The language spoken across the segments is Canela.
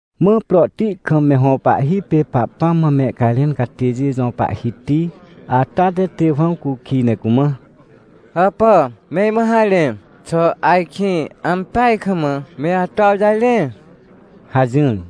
Mã prohti kam me hõ pahhi pê Pahpãm mã mehcajrẽn catêjê jõ pahhiti ata te Tewãw cukij ne cumã: — Hàpà, me imã harẽ. Xà ajkĩ ampeaj kam me ato awjarẽ? — hajỹr.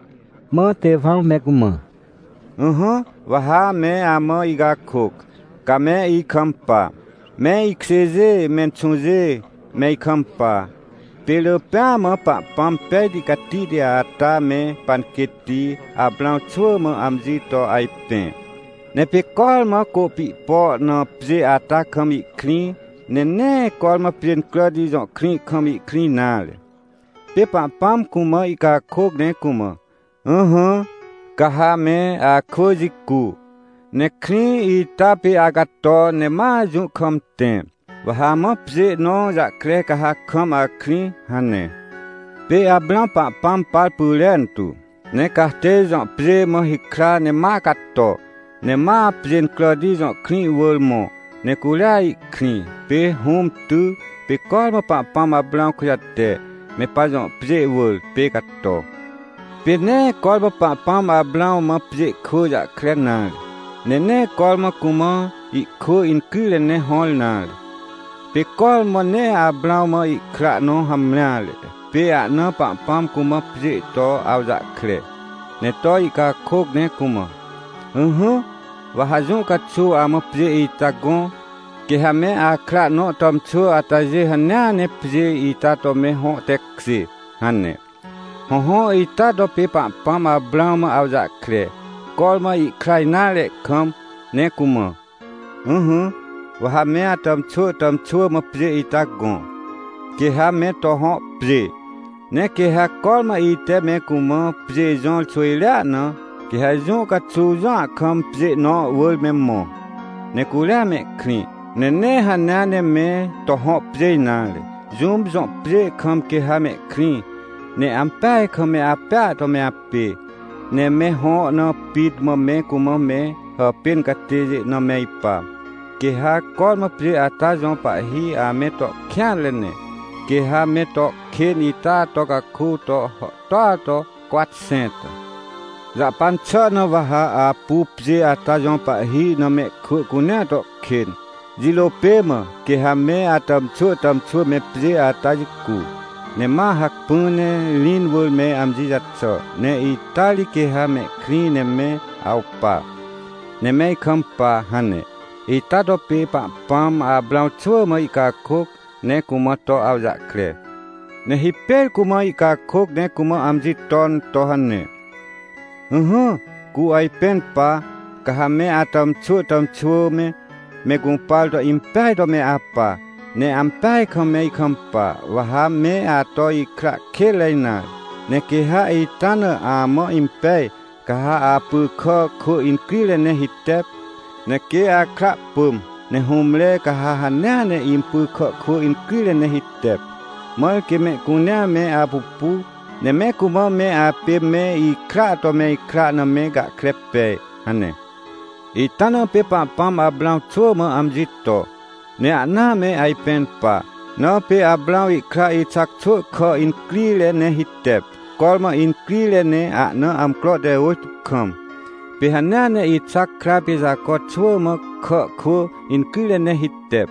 Mã Tewãw me cumã: — Ỹhỹ, wa ha me amã icakôc, ca me ikampa. Me ikjêjê, menxũjê, me ikampa. Pê rỳ pêa mã Pahpãm pejti catihti ata me panquêtti Aprãw xwỳ mã amji to ajpẽ. Ne pê cormã Côpihpo na pjê ata kam ihkrĩ, ne nee cormã Pjêncràti jõ krĩ kam ihkrĩ nare. Pê Pahpãm cumã ihcakôc ne cumã: “Ỹhỹ, ca ha me akwỳ jicu, ne krĩ ita pê acato ne ma jũ kam tẽ. Wa ha amã pjê nõ jahkre ca ha kam akrĩ” hane. — Pê Aprãw Pahpãm par pyrentu, ne Cartêj jõ pjê mã hikra ne ma cato. Ne ma Pjêncràti jõ krĩ wỳr mõ, ne curia ihkrĩ. Pê hũm ty. Pê cormã Pahpãm Aprãw kujate, me pajõ pjê wỳr, pê cato. Pê nee cormã Pahpãm Aprãw mã pjê kwỳ jahkre nare. Ne nee cormã cumã ihkwỳ incrire ne hõr nare. Pê cormã ne Aprãw mã ihkra nõ hamreare. Pê ahnaa Pahpãm cumã pjê to awjahkre, ne to ihcakôc ne cumã: “Ỹhỹ, wa ha jũ caxuw amã pjê ita gõ. Quê ha me akra nõ tàmxwỳ atajê hanea ne pjê ita to me hõ tekjê” hane. Hõhõ, ita to pê Pahpãm Aprãw mã awjahkre, cormã ihkra nare kam, ne cumã: “Ỹhỹ, wa ha me atàmxwỳ tàmxwỳ mã pjê ita gõ, quê ha me to hõ pjê, ne quê ha cormã ite me cumã pjê jõr xwỳjrea na, quê ha jũ caxuw jũa kam pjê nõ wỳr me mõ, ne curia mehkrĩ. Ne nee hanea ne me to hõ pjê nare. Jũm jõ pjê kam quê ha mehkrĩ, ne ampeaj kam me apêa to me apê. Ne me hõ na pit mã me cumã me hàpên catêjê na me ipa. Quê ha cormã pjê ata jõ pahhi ame to kêanre ne. Quê ha me to kên ita to caku to hàhtô to cwatxẽnta. Jahpan xà na wa ha apu pjê ata jõ pahhi na mehkwỳ cunea to kên. Jirô pê mã, quê ha me atàmxwỳ tàmxwỳ me pjê ata jicu, ne ma hacpỹ ne rĩn wỳr me amji jaxà. Ne ita ri quê ha mehkrĩ ne me awpa, ne me ikampa” hane. Ita to pê Pahpãm Aprãw xwỳ mã ihcakôc, ne cumã to awjahkre. — Ne hipêr cumã ihcakôc ne cumã amji ton to hane: “Ỹhỹ, cu ajpẽn pa. Ca ha me atàmxwỳ tàmxwỳ me, me gũpar to impeaj to me apa, ne ampeaj kam me ikampa, wa ha me ato ikra kênre nare. Ne quê ha ita na amã impej, ca ha apy kà kwỳ incrire ne hitep. Ne quê akra pỳm, ne hũmre, ca ha hanea ne impy kà kwỳ incrire ne hitep. Mãr quê mehcunea me apupu, ne me cumã me apê me ikraa to me ikra na me gahkre pej” hane. Ita na pê Pahpãm Aprãw xwỳ mã amji to, ne ahna me ajpẽn pa. Na pê Aprãw ihkra Ixac xwỳ kà incrire ne hitep, cormã incrire ne ahna amcro te ôjtô kam. Pê hanea ne Ixac kra pê Jaco xwỳ mã kà kwỳ incrire ne hitep.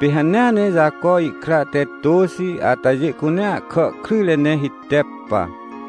Pê hanea ne Jaco ihkra te tôxi atajê cunea kà kryjre ne hitep pa.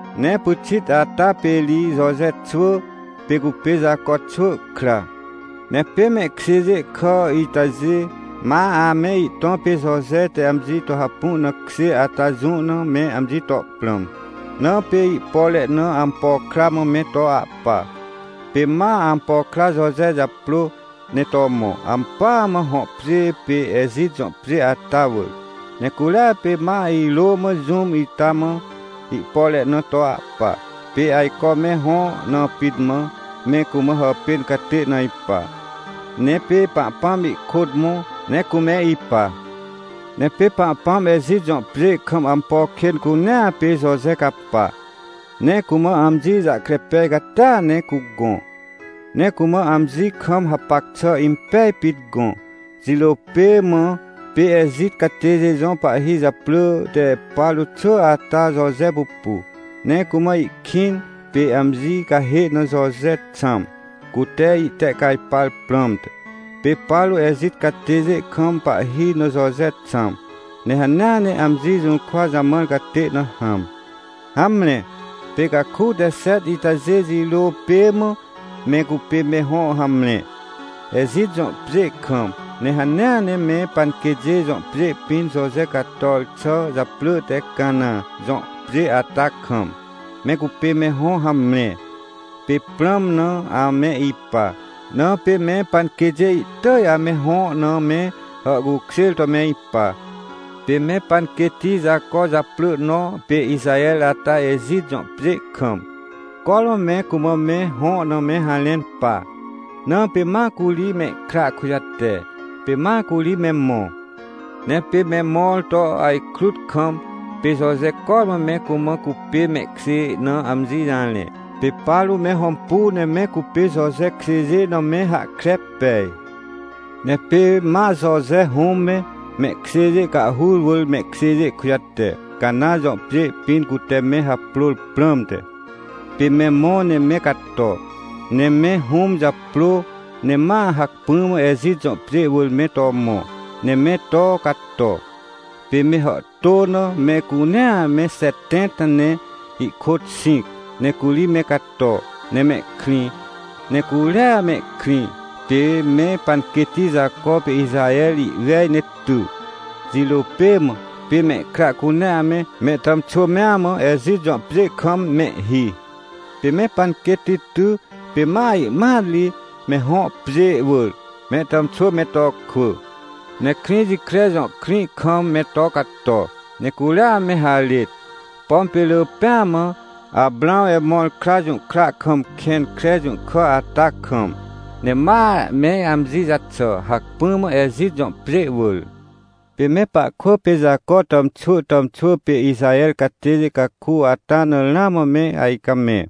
— Ne pyxit ata pê ri Joje xwỳ, pê cupê Jaco xwỳ kra. Ne pê mehkjêjê kà itajê ma ame ihtõ pê Joje te amji to hapu na kjê ata jũ na me amji to prãm, na pê ihpore na ampo kra mã me to ahpa. Pê ma ampo kra Joje japrô, ne to mõ, ampỳa mã hõ pjê pê Ejit jõ pjê ata wỳr. Ne curia pê ma irô mã jũm ita mã ihpore na to ahpa, pê ajco me hõ na pit mã, me cumã hàpên catê na ipa. Ne pê Pahpãm ihkôt mõ, ne cume ipa. Ne pê Pahpãm Ejit jõ pjê kam ampo kên cunea pê Joje capa. Ne cumã amji jahkre pej catia ne cugõ. Ne cumã amji kam hapac xà impej pit gõ. Jirô pê mã, pê Ejit catêjê jõ pahhi japrỳ te Paro xwỳ ata Joje pupu, ne cumã ihkĩn, pê amji cahê na Joje xãm, cute ihtehcajpar prãmte. Pê Paro Ejit catêjê kam pahhi na Joje xãm, ne hanea ne amji jũrkwa jamãr catê na hãm. — Hamre, pê caku te xet itajê jirô pê mã, me cupê me hõ hamre, Ejit jõ pjê kam, ne hanea ne me panquêtjê jõ pjê pĩn Joje cator xà japrỳ te Cana jõ pjê ata kam, me cupê me hõ hamre. Pê prãm na ame ipa. Na pê me panquêtjê ihtỳj ame hõ na me hàhcukjêr to me ipa. Pê me panquêtti Jaco japrỳ nõ pê Ixaher ata Ejit jõ pjê kam, cormã me cumã me hõ na me harẽn pa, na pê ma curi mehkra kujate, pê ma curi me mõ. Ne pê me mõr to ajkrut kam, pê Joje cormã me cumã cupê mehkjê na amji jarẽ. Pê Paro me hõmpu ne me cupê Joje kjêjê na me hahkre pej. Ne pê ma Joje hũm me, mehkjêjê cahhur wỳr mehkjêjê kujate, Cana jõ pjê pĩn cute me haprôr prãmte. Pê me mõ ne me cato, ne me hũm japrô, ne ma hacpỹ mã Ejit jõ pjê wỳr me to mõ, ne me to cato. Pê me hàhtô na mehcunea me xetẽnta ne ihkôt xĩc, ne curi me cato, ne mehkrĩ. Ne curia mehkrĩ, pê me panquêtti Jaco pê Ixaher ihwej ne ty. Jirô pê mã, pê mehkra cunea me, me tàmxwỳ mea mã Ejit jõ pjê kam mehhi. Pê me panquêtti ty pê ma ihmat ri, me hõ pjê wỳr, mehtàmxwỳ me to kwỳ. Ne Krĩjikre jõ krĩ kam me to cato, ne curia me harêt. Pom pê rỳ pêa mã, Aprãw Emõr kra jũhkra kam kẽn kre jũhkà ata kam. Ne ma me amji jaxà, hacpỹ mã Ejit jõ pjê wỳr. — Pê me pahkwỳ pê Jaco tàmxwỳ tàmxwỳ pê Ixaher catêjê caku ata na ramã me ajcamẽ,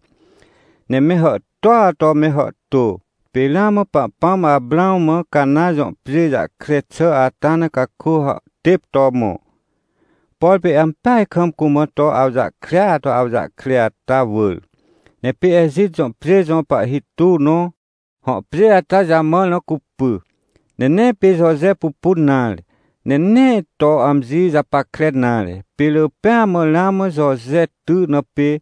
ne me hàhtôa to me hàhtô. Pê ramã Pahpãm Aprãw mã Cana jõ pjê jahkre xà ata na caku hàhtêp to mõ. Por pê ampeaj kam cumã to awjahkrea to awjahkre ata wỳr. Ne pê Ejit jõ pjê jõ pahhi tuw nõ hõ pjê ata jamãr na cupy. Ne nee pê Joje pupun nare, ne nee to amji japackre nare, pê rỳ pêa mã ramã Joje ty na pê.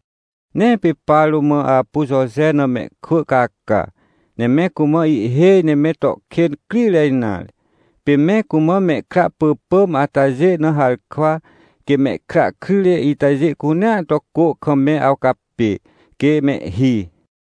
Ne pê Paro ma apu Joje na mehkwỳ caca, ne me cumã ihhêj ne me to kên crire nare. Pê me cumã mehkra pỳpỳm atajê na harkwa, quê mehkra kryjre itajê cunea to cô kam me awcapê, quê mehhi.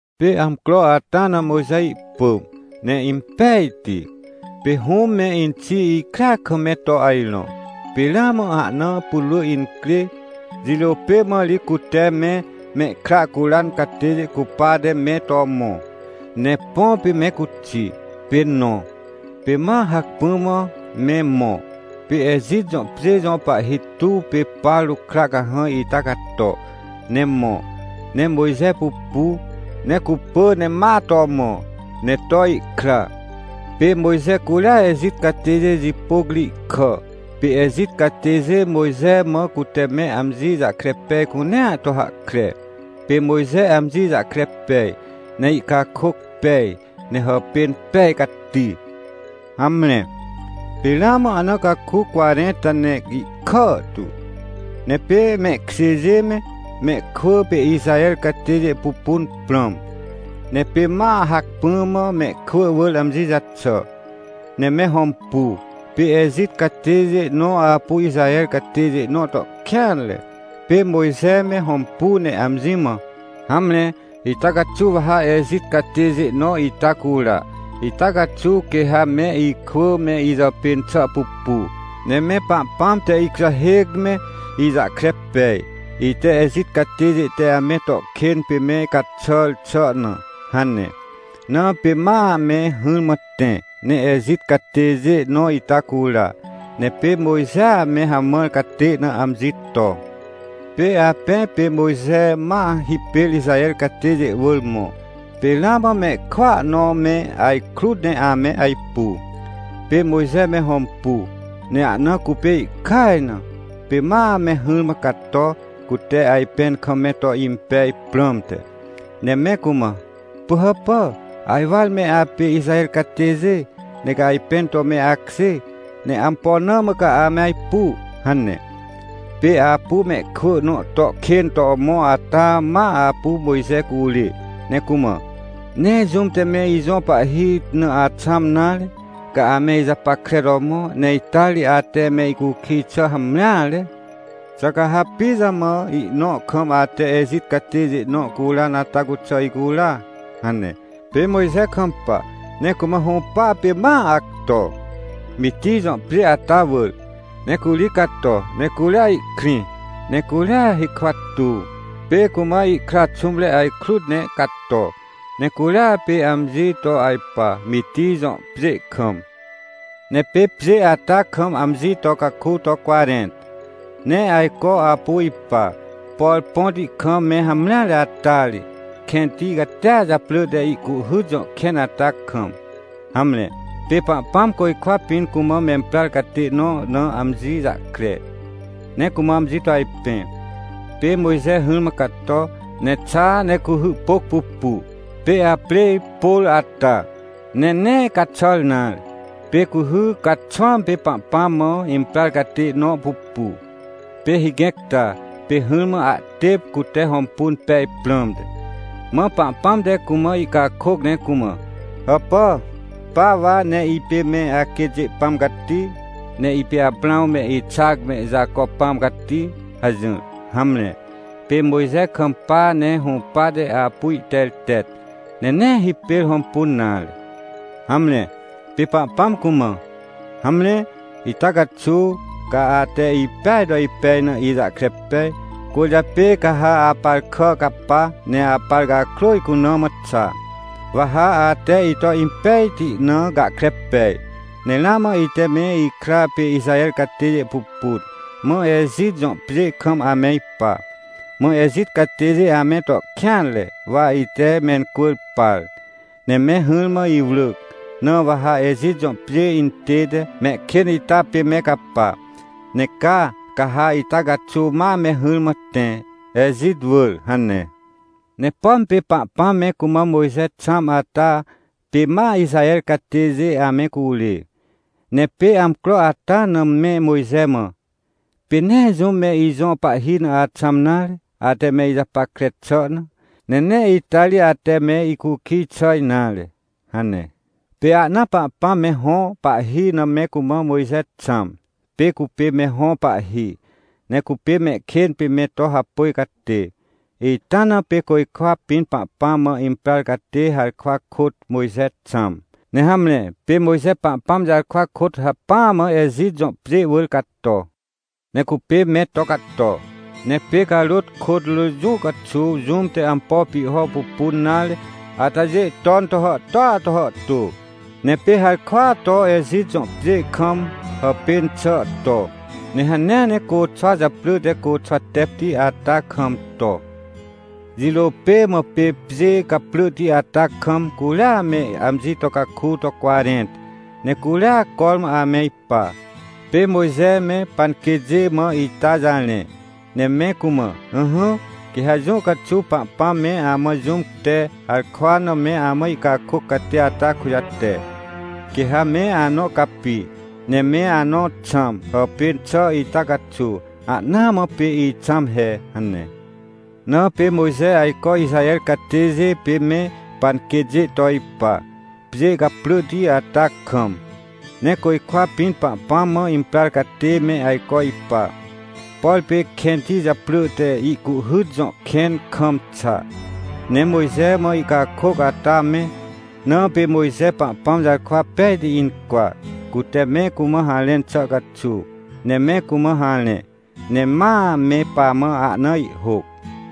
— Pê amcro ata na Mojxe ihpỳm, ne impejti. Pê hũm me inxi ikrea kam me to ajrõ, pê ramã ahna putwrỳ incrê. Jirô pê mã ri cute me mehkra curan catêjê cupate me to mõ, ne põ pê me cuxi, pê nõ. Pê ma hacpỹ mã me mõ, pê Ejit jõ pjê jõ pahhi tuw pê Paro kra cahãj ita cato, ne mõ, ne Mojxe pupu, ne cupỳ ne ma to mõ, ne to ihkra. Pê Mojxe, curia Ejit catêjê jipôc ri ihkà. Pê Ejit catêjê Mojxe mã cute me amji jahkre pej cunea to hahkre. Pê Mojxe amji jahkre pej, ne ihcakôc pej, ne hàpên pej cati. — Hamre, pê ramã ahna caku cwarẽnta ne ihkàhtu. Ne pê mehkjêjê me, mehkwỳ pê Ixaher catêjê pupun prãm. Ne pê ma hacpỹa mã mehkwỳ wỳr amji jaxà. Ne me hõmpu, pê Ejit catêjê nõ apu Ixaher catêjê nõ to kêanre. Pê Mojxe me hõmpu ne amji mã: “Hamre, ita caxuw wa ha Ejit catêjê nõ ita cura. Ita caxuw quê ha me ikwỳ me ijàpên xà pupu, ne me Pahpãm te ikujahêc me ijahkre pej, ite Ejit catêjê te ame to kên pê me caxàr xà na” hane. Na pê ma me hỹrmã tẽ, ne Ejit catêjê nõ ita cura. Ne pê Mojxea me hamãr catê na amji to. Pê apẽ pê Mojxe ma hipêr Ixaher catêjê wỳr mõ. Pê ramã mehkwỳa nõ me ajkrut ne ame ajpu. Pê Mojxe me hõmpu, ne ahna cupê ihkaj na. Pê ma me hỹrmã cato, cute ajpẽn kam me to impej prãmte. Ne me cumã: “Pỳhàpà, ajwar me apê Ixaher catêjê, ne ca ajpẽn to me akjê. Ne ampo na mã ca ame ajpu?” hane. — Pê apu mehkwỳ nõ to kên to mõ ata ma apu Mojxe curê, ne cumã: “Nee jũm te me ijõ pahhi na axãm nare. Ca ame ijapackre to mõ, ne ita ri ate me icukij xà hamreare. Xà ca ha pijamã ihnõ kam ate Ejit catêjê nõ curan ata cuxà icura?” hane. Pê Mojxe kampa, ne cumã hũpa pê ma acto, Mitij jõ pjê ata wỳr. Ne curi cato, ne curia ihkrĩ. Ne curia hikwa tuw, pê cumã ihkra xũmre ajkrut ne cato. Ne curia pê amji to ajpa, Mitij jõ pjê kam. — Ne pê pjê ata kam amji to caku to cwarẽnta. Ne ajco apu ipa, por põti kam me hamreare ata ri, kẽnti catia japrỳ te Ihcuhhyt jõ kẽn ata kam. Hamre, pê Pahpãm côjkwa pĩn cumã memprar catê nõ na amji jahkre, ne cumã amji to ajpẽ. Pê Mojxe hỹrmã cato, ne xa, ne cuhy pôc pupu, pê aprêj pôr ata, ne nee caxàr nare. Pê cuhy caxwãm pê Pahpãm mã imprar catê nõ pupu. Pê higẽc ta, pê hỹrmã ahtêp, cute hõmpun pej prãmte. Mã Pahpãm te cumã ihcakôc ne cumã: “Hàpà, pa wa, ne ipê me aquêtjê Pãm cati. Ne ipê Aprãw me, Ixac me, Jaco Pãm cati” hajỹr. Hamre, pê Mojxe kampa ne hũpate apu ihtertet, ne nee hipêr hõmpun nare. — Hamre, pê Pahpãm cumã: “Hamre, ita caxuw ca ate ipeaj to ipej na, ijahkre pej. Cwỳrjapê ca ha apar kà capa, ne apar cakrô icuna mã xa. Wa ha ate ito impejti na gahkre pej. Ne ramã ite me ikra pê Ixaher catêjê pupun. Mã Ejit jõ pjê kam ame ipa. Mã Ejit catêjê ame to kêanre, wa ite mencwỳr par, ne me hỹrmã iwrỳc. Na wa ha Ejit jõ pjê intête, mehkên ita pê me capa. Ne caa, ca ha ita caxuw ma me hỹrmã tẽ, Ejit wỳr” hane. — Ne pom pê Pahpãm me cumã Mojxe xãm ata pê ma Ixaher catêjê ame curê. Ne pê amcro ata na me Mojxe mã: “Pê nee jũm me ijõ pahhi na axãm nare, ate me ijapackre xà na. Ne nee ita ri ate me icukij xà nare” hane. Pê ahnaa Pahpãm me hõ pahhi na me cumã Mojxe xãm, pê cupê me hõ pahhi, ne cupê mehkên pê me to hapôj catê. Ita na pê côjkwa pĩn Pahpãm mã imprar catê harkwa kôt Mojxe xãm. Ne hamre, pê Mojxe Pahpãm jarkwa kôt hacpỹa mã Ejit jõ pjê wỳr cato. Ne cupê me to cato. Ne pê carôt kôt rỳ jũ caxuw jũm te ampo pihho pupun nare atajê ton to hàhtôa to hàhtô. Ne pê harkwa to Ejit jõ pjê kam hàpên xà to, ne hanea ne côxwa japrỳ te Côxwatepti ata kam to. Jirô pê mã pê pjê caprỳhti ata kam, curia me amji to caku to cwarẽnta, ne curia cormã ame ipa. — Pê Mojxe me panquêtjê mã ita jarẽ, ne me cumã: “Ỹhỹ, quê ha jũ caxuw Pahpãm me amã jũm te harkwa na me amã ihcakôc catê ata kujate. Quê ha me anõ capi, ne me anõ xãm, hàpên xà ita caxuw. Ahnaa mã pê ixãm he” hane. Na pê Mojxe ajco Ixaher catêjê pê me panquêtjê to ipa, pjê caprỳhti ata kam. Ne côjkwa pĩn Pahpãm mã imprar catê me ajco ipa, por pê kẽnti japrỳ te Ihcuhhyt jõ kẽn kam xa, ne Mojxe mã ihcakôc ata me. Na pê Mojxe Pahpãm jarkwa pejti incwa, cute me cumã harẽn xà caxuw. Ne me cumã harẽ, ne ma me pamã ahna ihhôc.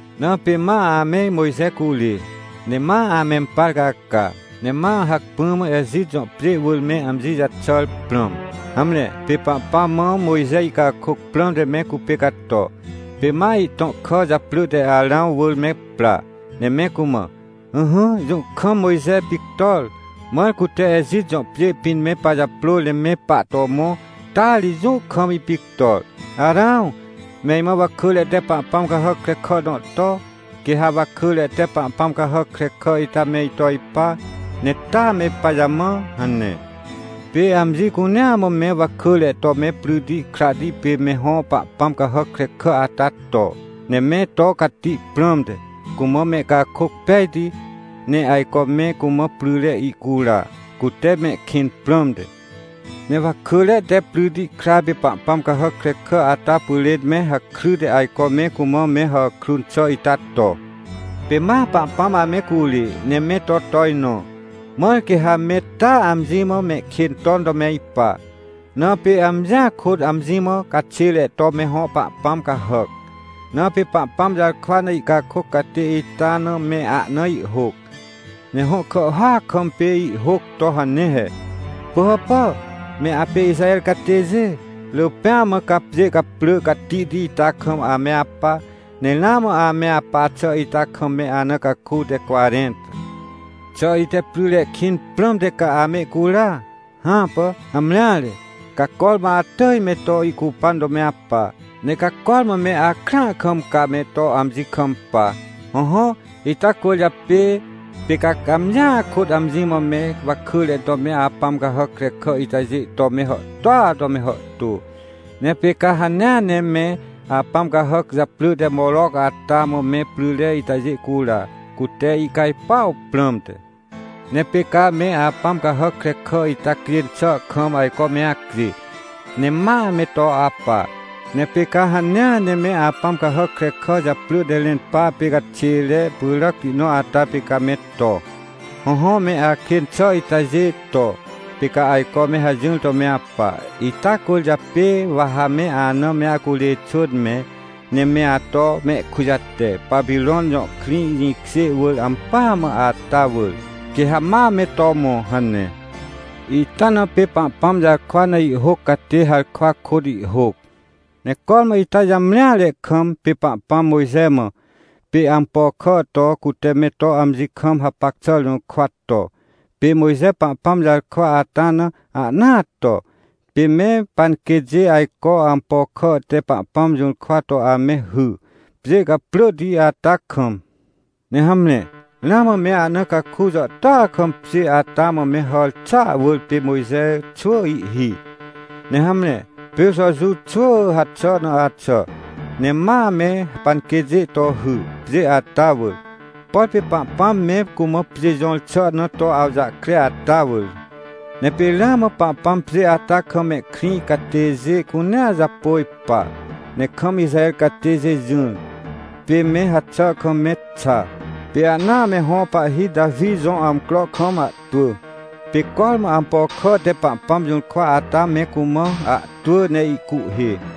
— Na pê ma ame Mojxe curê, ne ma amempar caca. Ne ma hacpỹ mã Ejit jõ pjê wỳr me amji jaxàr prãm. Hamre, pê Pahpãm mã Mojxe ihcakôc prãmte me cupê cato. Pê ma ihtõ kà japrỳ te Arãw wỳr me pra. Ne me cumã: “Ỹhỹ, jũ kam Mojxe pictor. Mãr cute Ejit jõ pjê pĩn me pajaprôr ne me pahto mõ, taa ri jũ kam ipictor. Arãw, me imã wakỳre te pahpãm cahàc krekà nõ to. Quê ha wakỳre te pahpãm cahàc krekà ita me ito ipa. Ne taa me pajamã” hane. — Pê amji cunea mã me wakỳre to me pryti krahti pê me hõ pahpãm cahàc krekà ata to, ne me to cati prãmte, cumã mehcakôc pejti. Ne ajco me cumã pryre ihcura, cute mehkĩn prãmte. Ne wakỳre te pryti kra pê pahpãm cahàc krekà ata pyrên me hakryte ajco me cumã me hàkrun xà ita to. Pê ma Pahpãm ame curê, ne me to tojnõ, mãr quê ha me taa amji mã mehkên ton to me ipa. Na pê amjia kôt amji mã caxêre to me hõ pahpãm cahàc. Na pê Pahpãm jarkwa na ihcakôc catê ita na me ahna ihhôc. Ne hõ kàhhôac kam pê ihhôc to hane he: “Pỳhàpà, me apê Ixaher catêjê. Rỳ pêa mã ca pjê caprỳ catihti ita kam ame apa, ne ramã ame apa xà ita kam me ana caku te cwarẽnta. Xà ite pryre kĩn prãmte ca amehcura? Hãpà. Hamreare, ca cormã atỳj me to ihcupan to me apa. Ne ca cormã me akrãa kam ca me to amji kampa. Hõhõ, ita cwỳrjapê pê ca amjia kôt amji mã me wakỳre to me apãm cahàc krekà itajê to me hàhtôa to me hàhtô. Ne pê ca hanea ne me apãm cahàc japrỳ te Moroc ata mã me pryre itajê cura, cute ihcajpuaw prãmte. Ne pê ca me apãm cahàc krekà ita cjên xà kam ajco me acjê, ne ma me to apa. Ne pê ca hanea ne me apãm cahàc krekà japrỳ te Renpa pê caxêre pyràcti nõ ata pê ca me to. Hõhõ, me akên xà itajê to, pê ca ajco me hajỹr to me apa. Ita cwỳrjapê wa ha me ana me acurê xwỳn mẽ, ne me ato mehkujate, Papirõn jõ krĩ jĩkjê wỳr ampỳa mã ata wỳr, quê ha ma me to mõ” hane. — Ita na pê Pahpãm jarkwa na ihhôc catê harkwa kôt ihhôc. — Ne cormã ita jamreare kam, pê Pahpãm Mojxe mã, pê ampo kà to, cute me to amji kam hapac xà jũrkwa to. Pê Mojxe Pahpãm jarkwa ata na, ahnaa to. Pê me panquêtjê ajco ampo kà te Pahpãm jũrkwa to ame hy, pjê caprỳhti ata kam. Ne hamre, ramã me ahna caku jàhtôa kam pjê ata mã me hàr xàa wỳr pê Mojxe xwỳ ihhi. Ne hamre, pê Jojuw xwỳ haxà na axà, ne ma me panquêtjê to hy, pjê ata wỳr. Por pê Pahpãm me cumã pjê jõr xà na to awjahkre ata wỳr. Ne pê ramã Pahpãm pjê ata kam mehkrĩ catêjê cunea japôj pa. Ne kam Ixaher catêjê jỹr, pê me haxà kam me xa. Pê ahnaa me hõ pahhi Tawi jõ amcro kam ahtwỳ. Pê cormã ampo kà te Pahpãm jũrkwa ata me cumã ahtwỳ ne ihcuhhê.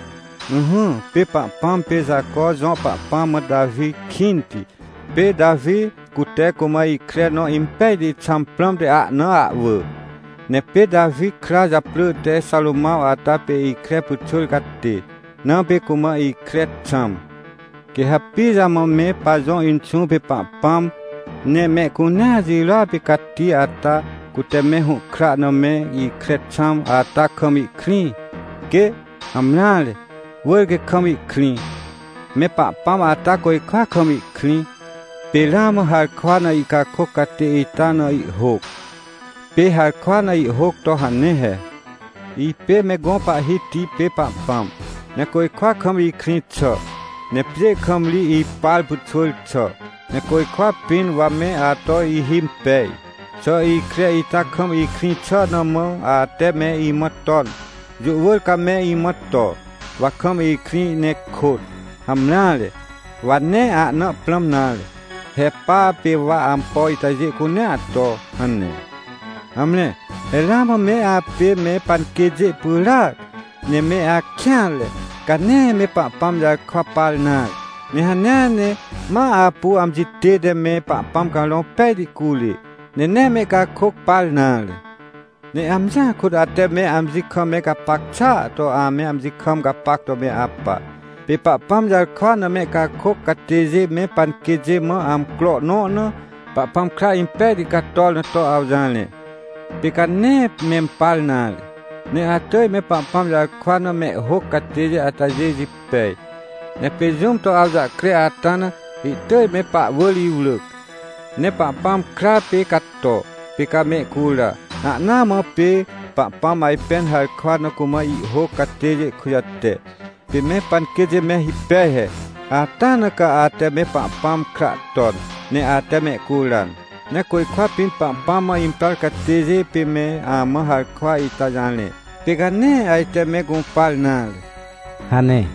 — Ỹhỹ, pê Pahpãm pê Jaco jõ Pahpãm mã Tawi kĩnti. Pê Tawi, cute cumã ikre nõ impejti xãm prãmte ahna ahwỳ. Ne pê Tawi kra japrỳ te Xarômãw ata pê ikre pyxwỳr catê, na pê cumã ikre xãm. — Quê ha pijamã me pajõ Inxũ pê Pahpãm ne mehcunea jirôa pê cati ata, cute me hũhkra na me ikre xãm, ata kam ihkrĩ? Quê! Hamreare! Wỳr quê kam ihkrĩ! Me Pahpãm ata côjkwa kam ihkrĩ. Pê ramã harkwa na ihcakôc catê ita na ihhôc. Pê harkwa na ihhôc to hane he: “Ipê me gõ Pahhiti pê Pahpãm. Ne côjkwa kam ikrĩ xà, ne pjê kam ri ipar pyxwỳr xà. Ne côjkwa pĩn wa me ato ihimpej. Xà ikre ita kam ikrĩ xà na mã ate me imã ton? Jũ wỳr ca me imã to, wa kam ikrĩ ne kôt. Hamreare! Wa nee ahna prãm nare. He pa pê wa ampo itajê cunea to” hane. — Hamre, he ramã me apê me panquêtjê pyràac, ne me akêanre! Ca nee me Pahpãm jarkwa par nare. Ne hanea ne ma apu amji tête me Pahpãm Carõ Pejti curê. Ne nee mehcakôc par nare. Ne amjia kôt ate me amji kam me gapac xàa to ame amji kam gapac to me apa. Pê Pahpãm jarkwa na mehcakôc catêjê me panquêtjê mã amcro nõ na Pahpãm kra impejti cator na to awjarẽ, pê ca nee mempar nare. Ne atỳj me Pahpãm jarkwa na mehhôc catêjê atajê jipej. Ne pê jũm to awjahkre ata na, ihtỳj me pahwỳr iwrỳc. Ne Pahpãm kra pê cato, pê ca mehcura. Ahnaa mã pê Pahpãm ajpẽn harkwa na cumã ihhôc catêjê kujate, pê me panquêtjê me hipej he, ata na ca ate me Pahpãm kra ton, ne ate mehcuran. Ne côjkwa pĩn Pahpãm mã imprar catêjê pê me amã harkwa ita jarẽ, pê ca nee ajte me gũpar nare — hane.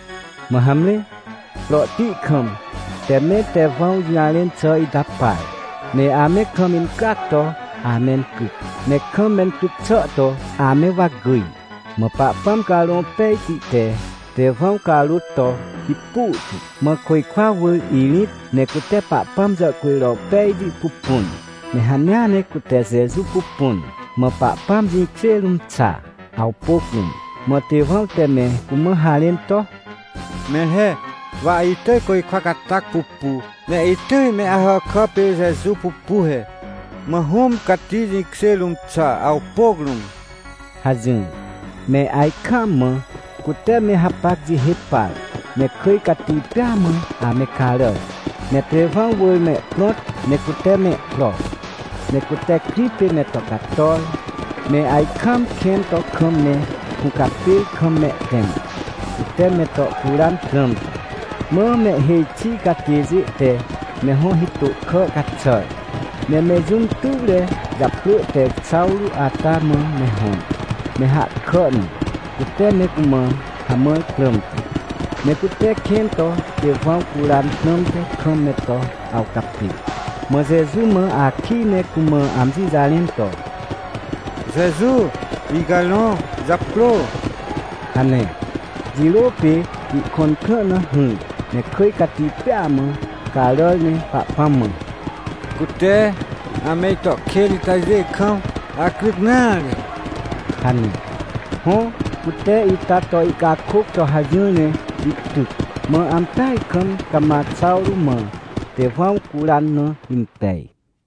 Mã hamre, prohti kam te me Tewãw jũjarẽn xà ita par. Ne ame kam incryac to amencryc, ne kam mencryc xà to ame wa gyj. Mã Pahpãm Carõ Pejti te Tewãw carôt to hipu tu, mã côjkwa wỳr irĩt, ne cute Pahpãm jàhcujro pejti pupun, ne hanea ne cute Jeju pupun, mã Pahpãm jĩkjê rũm xa, awpôc rũm. Mã Tewãw te me cumã harẽn to: — Mẽr he. Wa itỳj côjkwa catac pupu, ne itỳj me Ahàkà pê Jeju pupu he, mã Hũm Cati jĩkjê rũm xa, awpôc rũm — hajỹr. Me ajkaam mã cute me hapac jihê par, ne kỳj cati pêa mã ame caràr, ne Tewãw wỳr mehprõt ne cute mehpro. Ne cute krĩ pê me to cator, me ajkaam kẽn to kam me hũcapêr kam mehtẽm, cute me to curan prãmte. Mã mehhêj xi catêjê te me hõ hitô kà caxàr, ne me jũm tuwre japrỳ te Xawrô ata mã me hõr, me hahkà na, cute me cumã hamãr prãmte. Ne cute kẽn to Tewãw curan prãmte kam me to awcapê, mã Jeju mã akij ne cumã amji jarẽn to: — Jeju, icarõ japrô — hane. Jirô pê ihkõn krã na hỹr, ne kỳj cati pêa mã caràr ne Pahpãm mã: — Cute ame ito kên itajê kam acryc nare — hane. Hõ, cute ita to ihcakôc to hajỹr ne ihtyc. Mã ampeaj kam cama Xawrô mã Tewãw curan na impej.